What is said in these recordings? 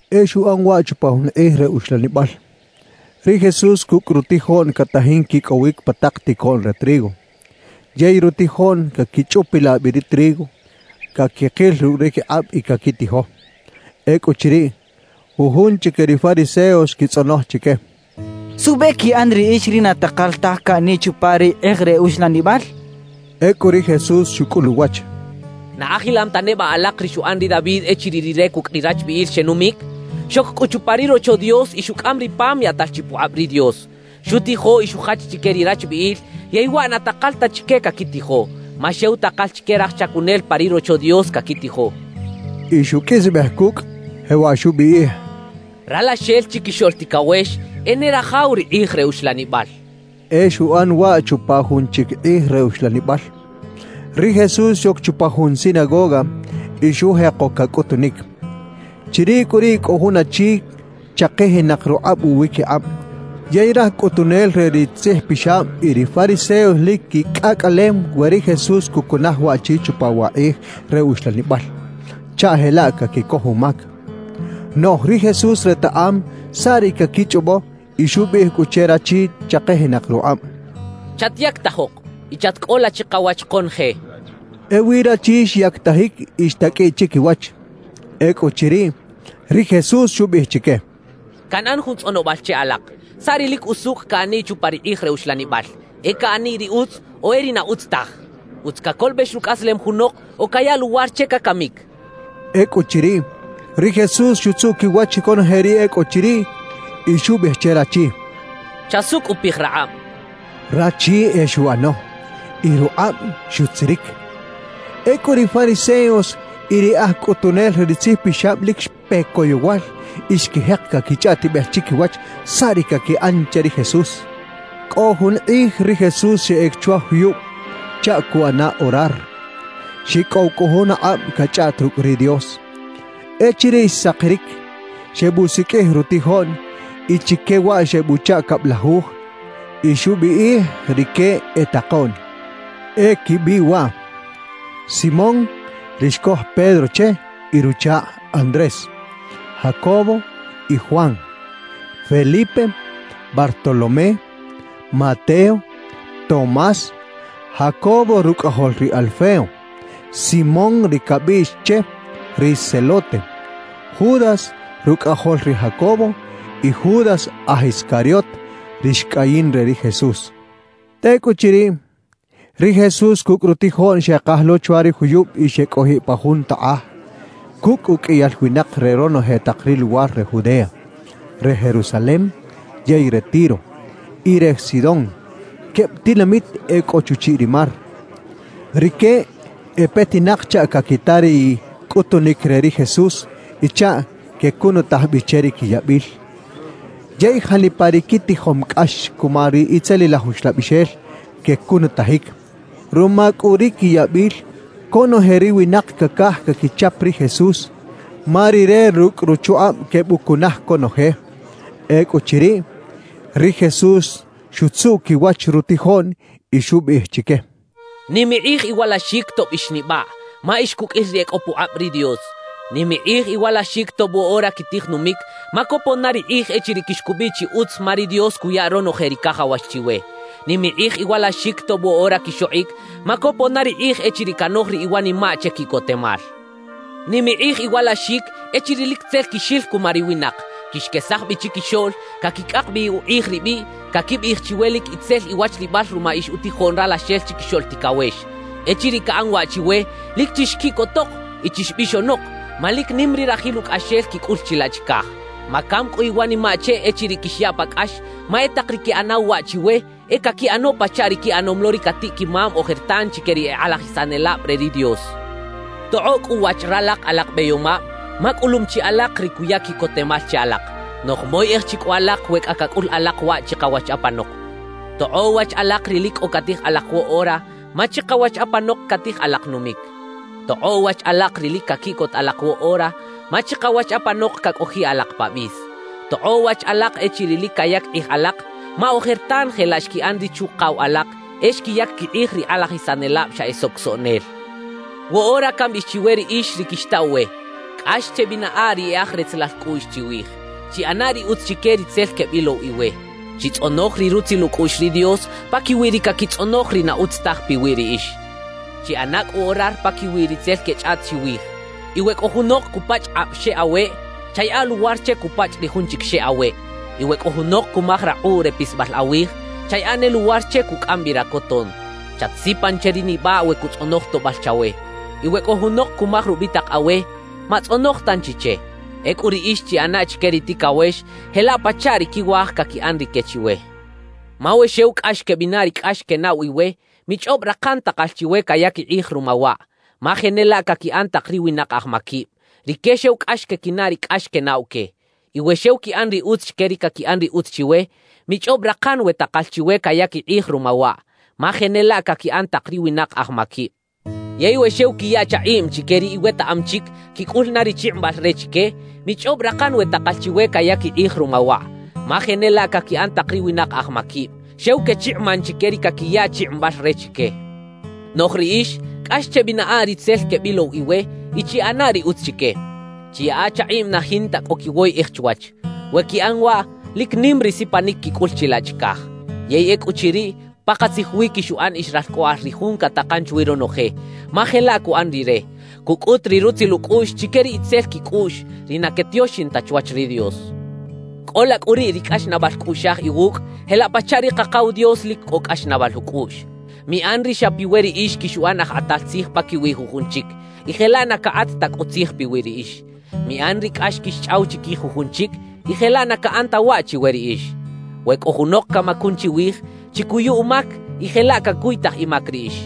E xuꞌan waꞌ chupa jun kꞌij re uxlanibal: Ri Jesús cucꞌ rutijoꞌn catajin quicꞌowic pa tak ticoꞌn re trigo, yey rutijoꞌn caquichꞌupilaꞌ bi ri trigo, caquikil rucꞌ ri quikꞌab y caquitijo. Ecꞌuchiriꞌ, jujun chique ri fariseos xquitzꞌonoj chique: —¿Suꞌbe quiꞌan riꞌix ri na takal taj caꞌaniꞌ chupa ri kꞌij re uxlanibal? —xechaꞌ. Ecꞌu ri Jesús xucꞌul uwach: —¿Na ajilam ta neba alak ri xuꞌan ri David echiriꞌ rire cucꞌ ri rachbiꞌil xenumic? Xoc cꞌu chupa ri Rocho Dios y xucꞌam ri pam yaꞌtal chi pukꞌab ri Dios. Xutijo y xujach chique ri rachbiꞌil; yey waꞌ na takal ta chique caquitijo, ma xew takal chique raj chacunel pa ri Rocho Dios caquitijo —xchaꞌ. Y xuqꞌuisbej cucꞌ, jewaꞌ xubiꞌij: —Ralaxel Chiquixoꞌl Ticawex e ne rajaw ri kꞌij re uxlanibal —xchaꞌ. E xuꞌan waꞌ chupa jun chic kꞌij re uxlanibal: Ri Jesús xoc chupa jun sinagoga y xujeko cacꞌutunic. Chiriꞌ cꞌu riꞌ cꞌo jun achi chakijinak rukꞌab uwiquikꞌab. Yey raj cꞌutunel re ri tzijpixab y ri fariseos lic quicꞌacꞌalem we ri Jesús cucunaj waꞌchi chupa wa kꞌij re uxlanibal, chaꞌ jelaꞌ caquicoj umac. Noꞌj ri Jesús retaꞌam saꞌ ri caquichꞌobo y xubiꞌij cꞌu che rachi chakijinak rukꞌab: —Chatyactajok y chatcꞌola chikawach konoje —xchaꞌ. Ewi rachi xyactajic y xtaqꞌuiꞌ chiquiwach. Ecꞌuchiriꞌ, ri Jesús xubiꞌij chique: —Canꞌan jun tzꞌonobal che alak. ¿Saꞌ ri lic usucꞌ caꞌaniꞌ chupa ri kꞌij re uxlanibal: E caꞌaniꞌ ri utz, o e ri na utz taj? ¿Utz cacolobex rucꞌaslem junok o cayaꞌ luwar che cacamic? —xchaꞌ. Ecꞌuchiriꞌ, ri Jesús xutzuꞌ quiwach conoje ri e cꞌo chiriꞌ, y xubiꞌij che rachi: —Chasucꞌupij rakꞌab —xchaꞌ. Rachi e xuꞌano, y rukꞌab xutziric. Ecꞌu ri fariseos y ri aj cꞌutunel re ri tzijpixab lic xpe coyowal y xquijek caquichꞌaꞌtibej chiquiwach saꞌ ri caquiꞌan che ri Jesús. Cꞌo jun kꞌij ri Jesús xeꞌec chwa juyub chaꞌ cuꞌana orar. Xicꞌow cꞌu jun akꞌab cachꞌaꞌt rucꞌ ri Dios. Echiriꞌ xsakiric, xebusiqꞌuij rutijoꞌn y chique waꞌ xebuchaꞌ cablajuj, y xubiꞌij rique e “takoꞌn”. E quibiꞌ waꞌ: Simón ri xcoj Pedro che y ruchakꞌ Andrés, Jacobo y Juan, Felipe, Bartolomé, Mateo, Tomás, Jacobo rucꞌajol ri Alfeo, Simón ri cabiꞌx che “ri Zelote”, Judas rucꞌajol ri Jacobo, y Judas aj Iscariot, ri xcꞌayin re ri Jesús. Tecꞌuchiriꞌ, ri Jesús cucꞌ rutijoꞌn xekaj lo chwa ri juyub y xecꞌojiꞌ pa jun takꞌaj cucꞌ uqꞌuiyal winak re ronoje tak ri luwar re Judea, re Jerusalem yey re Tiro y re Sidón, queb tinamit e cꞌo chuchiꞌ ri mar. Rique e petinak chaꞌ caquita ri cꞌutunic re ri Jesús y chaꞌ quecunutaj bi che ri quiyabil. Yey janipa ri quitijom cꞌax cuma ri itzelilaj uxlabixel, quecunutajic. Ruma cꞌu ri quiyabil, conoje ri winak cacaj caquichap ri Jesús, ma Rire rucꞌ ruchukꞌab quebucunaj conoje. Ecꞌuchiriꞌ, ri Jesús xutzuꞌ quiwach rutijoꞌn y xubiꞌij chique: «Nim ikꞌij iwalaxic tob ix nibaꞌ, ma ix cuqꞌuil ri e cꞌo pukꞌab ri Dios. Nim ikꞌij iwalaxic tob woꞌora quitij numic, ma copon na ri kꞌij echiriꞌ quixcubiꞌ chi utz ma ri Dios cuya ronoje ri cajawax chiwe. Nim ikꞌij iwalaxic tob woꞌora quixokꞌic, ma copon na ri kꞌij echiriꞌ canoj ri iwanimaꞌ che quiꞌcotemal. Nim ikꞌij iwalaxic echiriꞌ lic tzel quixil cuma ri winak, quixquesaj bi chiquixoꞌl, caquicꞌak bi ukꞌij ribiꞌ, caquibiꞌij chiwe lic itzel iwachlibal ruma ix utijoꞌn Ralaxel Chiquixoꞌl Ticawex. »Echiriꞌ caꞌan waꞌ chiwe, lic chixquiꞌcotok y chixbixonok, ma lic nim ri rajil ucꞌaxel quicꞌul chilaꞌ chicaj. Macam cꞌu iwanimaꞌ che echiriꞌ quixyaꞌ pa cꞌax; ma e tak ri queꞌanaw waꞌ chiwe, e caquiꞌano pachaꞌ ri quiꞌanom lo ri catiꞌ-quimam ojertan chique ri e kꞌalajisanelab re ri Dios. Tokꞌoꞌ cꞌu wach ralak alak beyomab, ma cꞌulum chi alak ri cuya quiꞌcotemal che alak, noꞌj moyeꞌej chi cꞌu alak we cꞌa cacꞌul alak waꞌ chikawach apanok. Tokꞌoꞌ wach alak ri lic cꞌo catij alak woꞌora, ma chikawach apanok catij alak numic. Tokꞌoꞌ wach alak ri lic caquiꞌcot alak woꞌora, ma chikawach apanok cacꞌojiꞌ alak pa bis. Tokꞌoꞌ wach alak echiriꞌ lic cayac kꞌij alak, ma ojertan jelaꞌ xquiꞌan ri chuꞌkaw alak, e xquiyac quikꞌij ri kꞌalajisanelab xa e socosoꞌnel. »Woꞌora cambiꞌij chiwe riꞌix ri quixtaw we: Cꞌax chebinaꞌa ri e aj retzelal cꞌuꞌx chiwij. Chiꞌana ri utz chique ri tzel quebilow iwe. Chitzꞌonoj ri rutzil ucꞌuꞌx ri Dios paquiwi ri caquitzꞌonoj ri na utz taj piwi riꞌix. Chiꞌana cꞌu orar paquiwi ri tzel quechꞌaꞌt chiwij. Y we cꞌo junok cupachꞌ kꞌab xeꞌ aweꞌ, chayaꞌa luwar che cupachꞌ ri jun chic xe aweꞌ. Y we cꞌo junok cumaj rakꞌuꞌ re pisbal awij, chayaꞌa ne luwar che cucꞌam bi racoton. Chatsipan che ri nibaꞌ we cutzꞌonoj toꞌbal chawe. Y we cꞌo junok cumaj rubitak awe, matzꞌonoj tanchi che. Ecꞌu riꞌix chiꞌana chique ri ticawex jelaꞌ pachaꞌ ri quiwaj caquiꞌan rique chiwe. »Ma we xew cꞌax quebinaꞌ ri cꞌax quenaꞌw iwe, michꞌob rakan takal chiwe cayac ikꞌij ruma waꞌ; ma jenelaꞌ caquiꞌan tak ri winak aj maquib; rique xew cꞌax quequinaꞌ ri cꞌax quenaꞌw que. Y we xew quiꞌan ri utz chique ri caquiꞌan ri utz chiwe, michꞌob rakan we takal chiwe cayac ikꞌij ruma waꞌ; ma jenelaꞌ caquiꞌan tak ri winak aj maquib. Yey we xew quiya chakꞌiꞌm chique ri iwetaꞌam chic quicꞌul na ri chikꞌimbal re chique, michꞌob rakan we takal chiwe cayac ikꞌij ruma waꞌ; ma jenelaꞌ caquiꞌan tak ri winak aj maquib; xew quechikꞌiman chique ri caquiya chikꞌimbal re chique. »Noꞌj riꞌix, cꞌax chebinaꞌa ri tzel quebilow iwe y chiꞌana ri utz chique. Chiyaꞌa chakꞌiꞌm na jinta cꞌo quiwoyꞌej chwach. We quiꞌan waꞌ, lic nim ri sipanic quicꞌul chilaꞌ chicaj; yey ecꞌuchiriꞌ, pakatzij wi quixuꞌan ix ralcꞌoꞌal ri Jun catakan chwi ronoje, ma jelaꞌ cuꞌan Rire, cucꞌut ri rutzil ucꞌuꞌx chique ri itzel quicꞌuꞌx, ri na quetioxin ta chwach ri Dios. Cꞌola cꞌu riꞌ ri cꞌaxnaꞌbal cꞌuꞌxaj iwucꞌ jelaꞌ pachaꞌ ri Kakaw Dios lic cꞌo cꞌaxnaꞌbal ucꞌuꞌx. »Miꞌan ri xa piwe riꞌix quixuꞌan aj kꞌatal tzij paquiwi jujun chic, y jelaꞌ na cakꞌat ta cꞌu tzij piwi riꞌix. Miꞌan ri cꞌax quixchꞌaw chiquij jujun chic, y jelaꞌ na caꞌan ta waꞌ chiwe riꞌix. We cꞌo junok camacun chiwij, chicuyu umac y jelaꞌ cacuytaj imac riꞌix.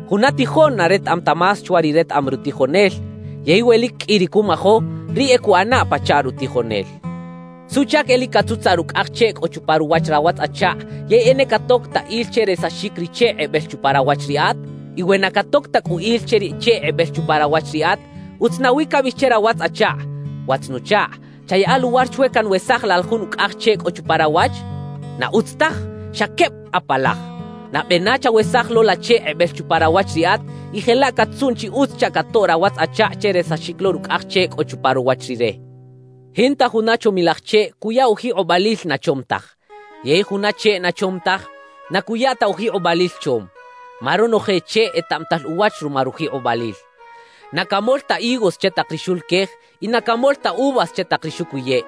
Juna tijoꞌn na retaꞌam ta más chwa ri retaꞌam rutijonel. Yey we lic qꞌui ri cumajo, riꞌ e cuꞌana pachaꞌ rutijonel. »¿Suꞌchac e lic catzutzaꞌ rucꞌaj cheꞌ cꞌo chupa ruwach rawatz-achakꞌ yey e na catoc ta il che resaxic ri cheꞌ kꞌebel chupa rawach riꞌat? Y we na catoc ta cꞌu il che ri cheꞌ kꞌebel chupa rawach riꞌat, ¿utz nawi cabiꞌij che rawatz-achakꞌ: “Watz-nuchakꞌ, chayaꞌa luwar chwe canwesaj la jun ucꞌaj cheꞌ cꞌo chupa rawach”? ¡Na utz taj! ¡Xa queb apalaj! Nabe na chawesaj lo la cheꞌ kꞌebel chupa rawach riꞌat, y jelaꞌ cat-tzuꞌn chi utz chaꞌ catoꞌ rawatz-achakꞌ che resaxic lo rucꞌaj cheꞌ cꞌo chupa ruwach rire. »Jinta juna chomilaj cheꞌ cuya ujikꞌobalil na chom taj, yey juna cheꞌ na chom taj, na cuya ta ujikꞌobalil chom. Ma ronoje cheꞌ etaꞌmatal uwach ruma rujikꞌobalil. Na camol ta higos che tak ri xuluquej y na camol ta uvas che tak ri xucuyeꞌ.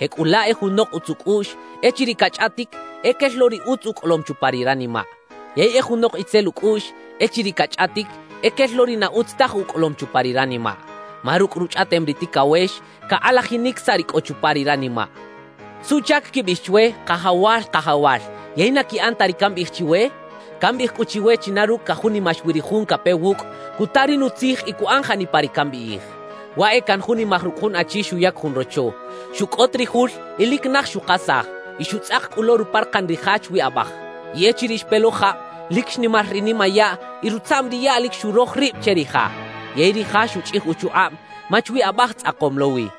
»Jecꞌulaꞌ e junok utz ucꞌuꞌx, echiriꞌ cachꞌaꞌtic, e quel lo ri utz ucꞌolom chupa ri ranimaꞌ. Yey e junok itzel ucꞌuꞌx, echiriꞌ cachꞌaꞌtic, e quel lo ri na utz taj ucꞌolom chupa ri ranimaꞌ. Ma rucꞌ ruchꞌaꞌtem ri ticawex, cakꞌalajinic saꞌ ri cꞌo chupa ri ranimaꞌ. »¿Suꞌchac quibiꞌij chwe “Kajawal, Kajawal”, yey na quiꞌan ta ri cambiꞌij chiwe? Cambiꞌij cꞌu chiwe china rucꞌ cajunimax wi ri jun cape wucꞌ, cuta ri nutzij y cuꞌan janipa ri cambiꞌij: »Waꞌ e canjunimaj rucꞌ jun achi xuyac jun rocho. Xucꞌot ri jul y lic naj xukasaj y xutzꞌak cꞌu lo ruparakan ri ja chwi abaj. Y echiriꞌ xpe lo jab, lic xnimar ri nimayaꞌ y rutzaꞌm ri yaꞌ lic xuroj rib che ri ja; yey ri ja xuchꞌij uchukꞌab, ma chwi abaj tzꞌakom lo wi.